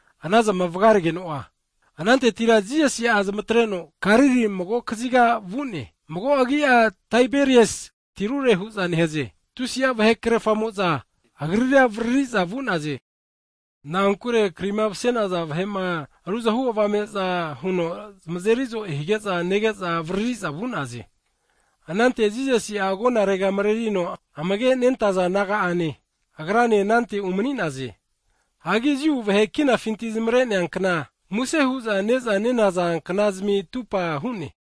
Anazama vgaregeno'a, anantetira Jisasi'a zamatreno Galili mago kaziga vu'ne, mago agi'a Taiberias tirure hu'za nehaze. Tusi'a vahe krerfamo'za Agrira avariri'za vu'naze, na'ankure krima vase'naza vahe'ma kaguvazana huno zamazeri so'e hige'za nege'za avariri'za vu'naze. Anante Jisasi'a agonarega mrerino amage nentaza disaipol naga'ane Agrane anante umani'naze. Hagi Jiu vahe kinafinti zamare'nea kna (Pasova) muse hu'za ne'za ne kna'zmi atupa hu'ne.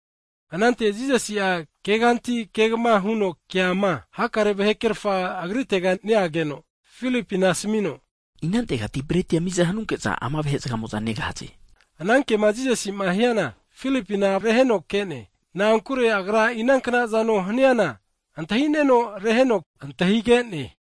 Anante Jisasi'a, keganti kegma huno keama hakare vahe krerfa Agritega neageno Filipina asmino, Inantegati bretia miza hanunke'za ama vahe'mo'za negahaze? Ama kema Jisasima hiana Filipina reheno ke'ne, na'ankure Agra inankna zano hni'ana antahi'neno, reheno antahige'ne.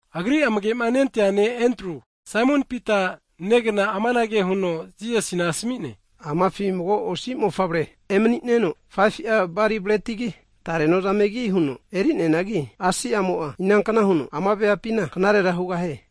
Agri amagema nentea disaipol ne' Endru, Saimon Pita negna amanage huno Jisasina asmi'ne, Amafi mago osi mofavre emani'neno 5fu'a bali bretigi, tare nozamegi huno eri'neanagi, asi'amo'a inankna huno ama veapina knarera hugahie?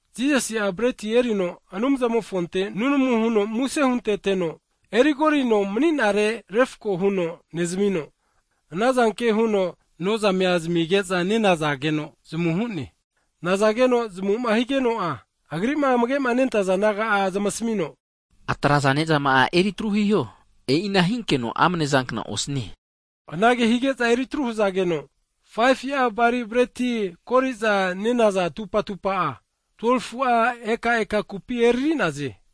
Jisasi'a breti erino Anumzamofonte nunamu hunteteno, erigorino mani'nare refko huno nezmino, anazanke huno nozamea zamige'za nenazageno zamu hu'ne. Nazageno zamu'ma higeno'a, Agri'ma amage' nentaza disaipol naga'a zamasmino, atraza ne'zama'a eri atru hiho, e'inahinkeno amne zankna osnie. Anage hige'za eri atru hzageno, 5fu'a bali bretima kori'za ne'naza atupa atupa'a, 12fu'a eka'eka kupi eriri'naze.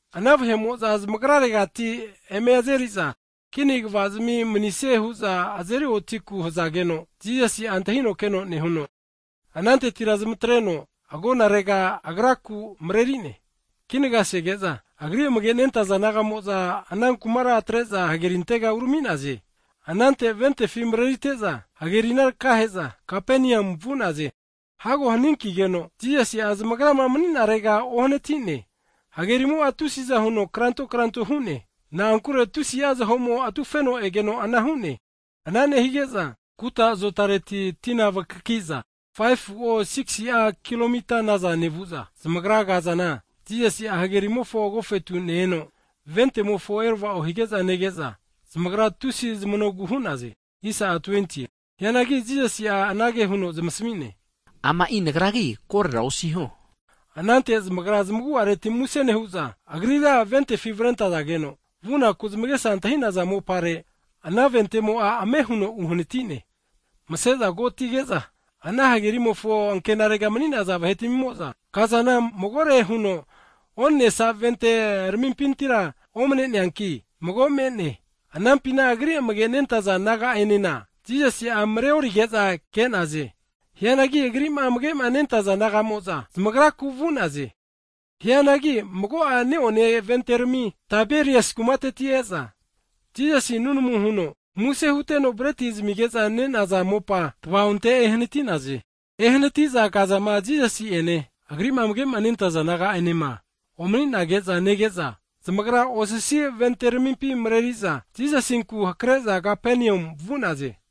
Ana vahe'mo'za zamagraregati eme azeriza kini kvazmi manisie hu'za azeri otiku hzageno, Jisasi'a antahino keno nehuno, anantetira zamatreno agonarega Agraku mreri'ne. Kinaga sege'za, Agri amage' nentaza disaipol naga'mo'za ana kumara atre'za hagerintega urami'naze. Anante ventefi marerite'za, hagerina tkahe'za Kapenium vu'naze. Hago haninkigeno Jisasi'a zamagrama mani'narega uohanati'ne. Hagerimo'a tusiza huno kranto kranto hu'ne, na'ankure tusi'a zaho'mo atufeno egeno ana hu'ne. Ana nehige'za kuta azotareti tina vakakiza 5fu'o, 6si'a kilo mita naza nevu'za zamagra kazana Jisasi'a hagerimofo agofetu ne-eno ventemofo erava'o hige'za nege'za, zamagra tusi zamanogu hu'naze. Hianagi Jisasi'a anage huno zamasmi'ne, ama Nagragi, korera osiho. Anante zamagra zamagu'areti muse nehu'za, Agrira ventefi avrentazageno, vunaku zamagesa antahi'naza mopare ana ventemo'a ame huno uhanati'ne. Vase'za ko'atige'za, ana hagerimofo ankenare mani'naza vahetmimo'za kazana magore huno onensa vente ramimpintira omne'neanki mago me'ne, anampina Agri amage nentaza disaipol naga'enena Jisasi'a mreorige'za ke'naze. Hianagi Agri'ma amage' nentaza nagamo'za zamagraku vu'naze. Hianagi mago'a ne'one vente rami Taiberias kumateti e'za, Jisasi susu huteno breti zamige'za ne'naza mopa tva'onte ehnati'naz e. Ehnati'za kazama Jisasi'ene, Agri'ma amage nentaza disaipol naga'anema omninage'za nege'za, zamagra osasi vente ramimpi mreri'za, Jisasinku hakre'za Kapenium vu'naze.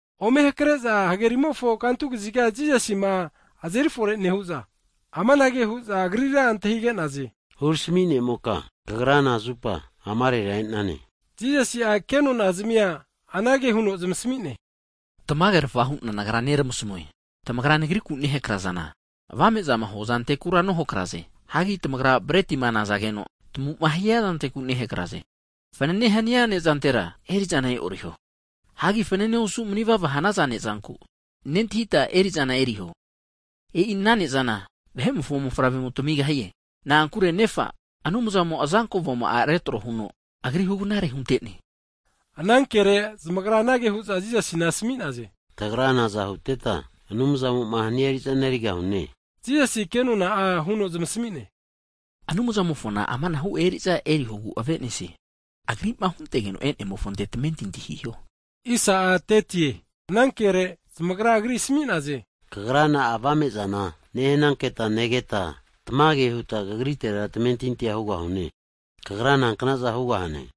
Ome hakre'za hagerimofo kantu kaziga Jisasima azeri fore nehu'za, amanage hu'za Agrira antahige'naze, Hurami ne'moka (Rabbai) Kagra nazupa amarera e'nane? Jisasi'a kenonazmia anage huno zamasmi'ne, Tamage hu'na Nagra neramasmue, tamagra Nagriku nehakra'zana, kaguvazma hua zantekura nohakraze. Hagi tamagra bretima nazageno tmu'ma hia zanteku nehakraze. Fanane hania ne'zantera eri'zana e'oriho. Hagi fanane osu manevava hanaza ne'zanku nentahita eri'zana eriho, e'i ana ne'zana Vahe'mofo Mofavremo tamigahie. Na'ankure Nefa, Anumzamo azanko avoma'a retro huno Agri hugnare hunte'ne. Anankere zamagra anage hu'za Jisasina asmi'naze, tagra naza huteta, Anumzamo'ma hania eri'zana erigahune? Jisasi kenona'a huno zamasmi'ne, Anumzamofona amanahu eri'za erihogu avenesie, Agri'ma huntegeno e'nemofonte tamentinti hiho. Anankere zamagra Agri asmi'naze, Kagra na'a avame'zana nehnanketa negeta, tamage huta Kagritera tamentinti'a hugahune? Kagra nankna'za hugahane?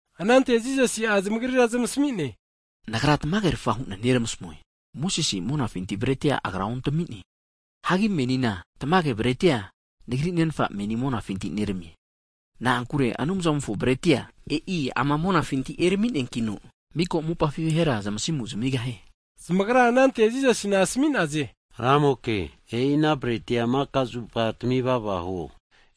Anante Jisasi'a zamagrira zamasmi'ne, Nagra tamage, rfa hu'na neramasmue, Mosese'a monafinti bretia agra ontami'ne, hagi menina tamage bretia Nagri Nenfa monafinti neramie. Na'ankure Anumzamofo bretia e'i ama monafinti erami'neankino, miko mopafi vahera zamasimu zamigahie. Zamagra anante Jisasina asmi'naze, Ramoke, e'i ana bretia maka'zupa tmivava huo.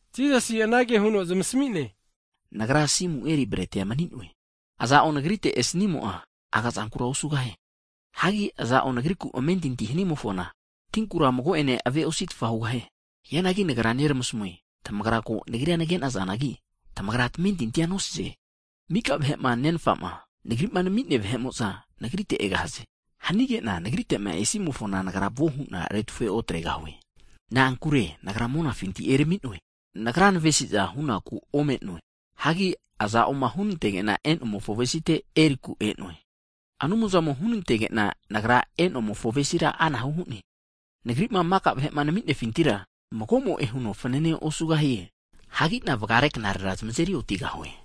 Jisasi anage huno zamasmi'ne, Nagra asimu eri bretia mani'noe, aza'o Nagrite esnimo'a aga'zankura osugahie. Hagi aza'o Nagriku amentinti hanimofona tinkura mago'ene ave'ositfa hugahie. Hianagi Nagra neramasmue, tamagra ko Nagrira nage'nazanagi, tamagra tamentintia nosaze. Maka vahe'ma Nenfa'ma, Nagri'ma nenmia vahe'mo'za Nagrite egahaze, hanige'na Nagrite'ma esimofona Nagra vuo hu'na retufe otregahue. Na'ankure Nagra monafinti erami'noe, Nagra navesi'za hunaku ome'noe, hagi hunantege'na e'nomofo avesite erinaku e'noe. Anumzamo hunantege'na Nagra e'nomofo avesira anahu hu'ne! Nagri'ma maka vahe'ma nami'nefintira mago'moe huno fnane osugahie, hagina vgare knarera zamazeri otigahue.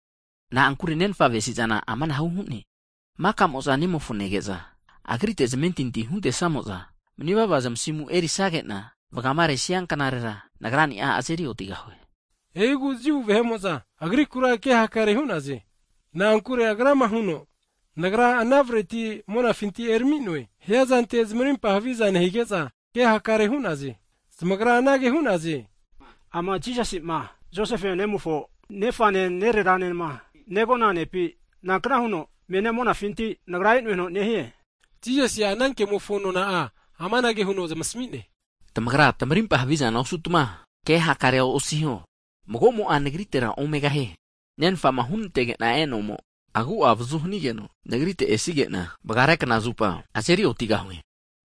Na'ankure Nenfa avesi'zana amanahu hu'ne, maka'mo'za Nemofo nege'za Agrite zamentinti huntesamo'za manivava zamasimu erisage'na, vgamaresia knarera Nagrani'a azeri otigahue. E'igu Jiu vahe'mo'za Agrikura ke hakare hu'naze, na'ankure Agrama huno Nagra ana breti monafinti erami'noe hiazante zamarimpa haviza nehige'za ke hakare hu'naze. Zamagra anage hu'naze, ama Jisasi'ma, Josefe nemofo, nefane nereranema negona nepi? Nankna huno menia monafinti Nagra e'noe huno nehie? Jisasi'a ana kemofo nona'a, amanage huno zamasmi'ne, Tamagra tamarimpa havizana osutma ke hakare osiho. Mago'mo'a Nagritera omegahie, Nenfa'ma hunantege'na e'nomo agu'a avazu hanigeno Nagrite esige'na, vgare kna zupa azeri otigahue.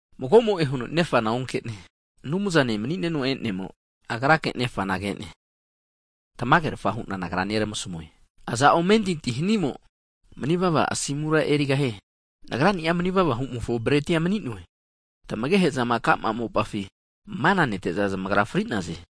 Mago mo'e huno Nefana onke'ne, Anumzane mani'neno e'nemo Agrake Nefana ke'ne. Tamage hu'na Nagra neramasmue, aza'o amentinti hanimo manivava asimura erigahie. Nagra'ni'a manivava hu'mofo bretia mani'noe. Tmagehe'za ka'ma mopafi mana nete'za zamagra fri'naze.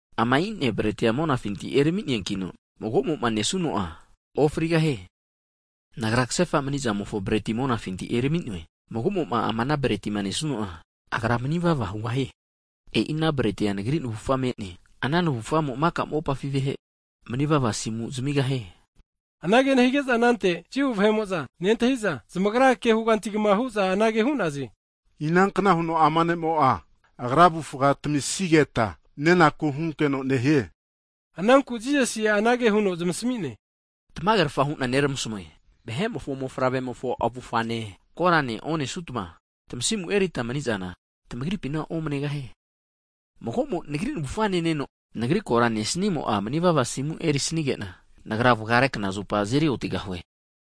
Ama'ina bretia monafinti ermi'neankino, mago'mo'ma nesuno'a ofri manigahie. Nagra ksefa mani'zamofo breti monafinti eramino'e, mago'mo ama ana bretima nesuno'a, agra manivava hugahie, E'i ana bretia Nagri navufa me'ne, ana navufamo maka mopafi vahe manivava asimu zamigahie. Anage nehige'za anante Jiu vahe'mo'za nentahi'za, zamagra ke hugantigma hu'za anage hu'naze, Inankna huno ama ne' mo'a Agra avufa tamisigeta nenaku hunkeno nehie? Ananku Jisasi'a anage huno zamasmi'ne, Tamage rfa hu'na neramasmue, Vahe'mofo Mofavre'mofo avufane, korane onesutma tamasimu eritma mani'zana tamagripina omnegahie. Mago'mo, Nagri navufa neneno, Nagri kora nesimo'a manivava asimu erisanige'na, Nagra vgare knazupa azeri otigahue.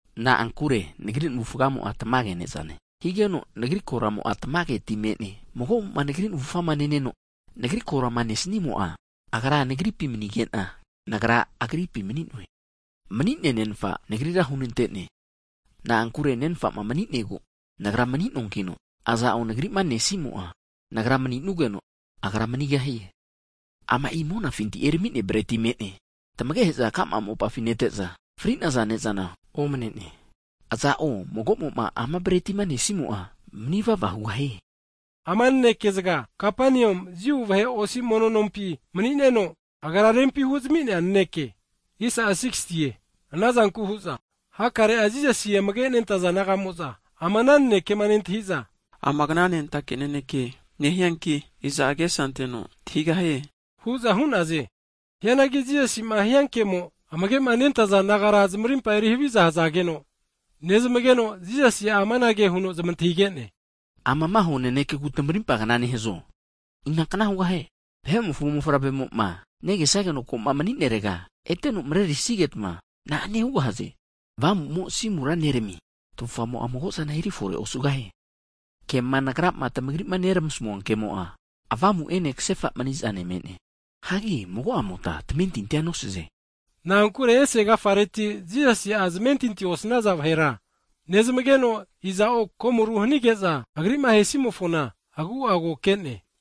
Na'ankure Nagri navufgamo'a tamage ne'zane, higeno Nagri koramo'a tamage ti me'ne. Mago'mo Nagri navufa neneno, Nagri korama nesnimo'a, agra Nagripi manige'na, Nagra agripi nemnue. Mani'nea Nenfa, Nagrira hunante'ne, na'ankure Nenfa'ma mani'negu Nagra mani'noankino, aza'o Nagri'ma nesimo'a, Nagra mani'nogu agra manigahie. Ama'i monafinti ermi'nea breti me'ne. Tmagehe'za ka'ma mopafi nete'za fri'naza ne'zana omne'ne, aza'o mago'mo ama bretima nesimo'a manivava hugahie. Ama naneke zga Kapenium Jiu vahe osi mono nompi (sinagog) mani'neno Agra'a rempi huzami'nea naneke. Anazanku hu'za hakare'a Jisasi amage nentaza disaipol naga'mo'za, ama ana nanekema nentahi'za, ama kna'nentake naneke nehianki, iza agesa anteno antahigahie? hu'za hu'naze. Hianagi Jisasi'ma hiankemo amage' nentaza disaipol nagara zamarimpa eri haviza hzageno, nezmageno, Jisasi amanage huno zamantahige'ne, Amama hua nanekegu tmarimpa kna nehazo? Inankna hugahie, Vahe'mofo Mofavremo'ma negesageno ko'ma mani'nerega ete marerisigetma na'ane hugahaze? Avamu'mo asimura neramie, tavufgamo'a mago'zana eri fore osugahie. Kema nagrama tamagrima neramasmua kemo'a, avamu ene ksefa mani'zane me'ne. Hianagi mago'amota tamentintia nosaze. Na'ankure ese agafareti Jisasi'a zamentinti osnaza vahera, nezmageno iza'o komoru hanige'za Agri'ma ahe simofona agu'a ko ke'ne.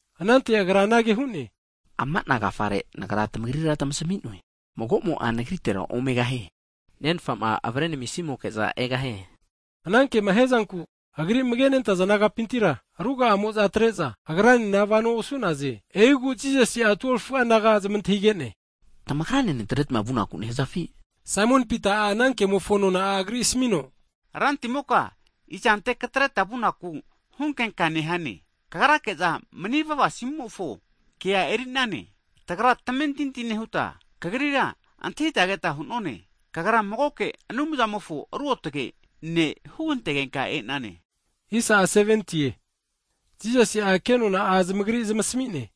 Anante Agra anange hu'ne, ama'na agafare nagra tmagrira tmasmi'noe, mago'mo'a Nagritera omegahie, Nenfa'ma avare namisimoke'za egahie. Ana kema hiazanku Agri amage nentaza disaipol nagapintira ruga'amo'za atre'za, Agranena vano osu'naze. E'igu Jisasi'a 12fu'a naga'a zamantahige'ne, Tamagrane natretma vunaku nehazafi? Saimon Pita'a ana kemofo nona'a Agri asmino, Rantimoka izante katreta vunaku hunkenka nehane? Kagri kemo manivava asimura nemie. Tagra tamentinti nehuta Kagrira antahita keta hu'none, Kagra magoke Anumzamofo Ruotge' ne', hugantegenka e'nane. Jisasi'a ke nona'a zamagri zamasmi'ne,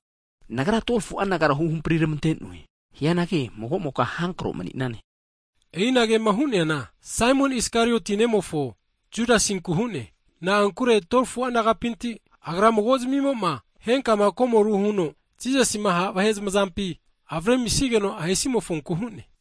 Nagra 12fu'a nagara huhampri tmante'noe, hianagi mago'moka havi avamu mani'nane. E'i anagema hu'neana Saimon Iskarioti nemofo Judasinku hu'ne, na'ankure 12fu'a nagapinti, agra mago zmimoma henkama komoru huno Jisasima ha' vahe zmazampi avrezamisigeno ahesamofonku hune.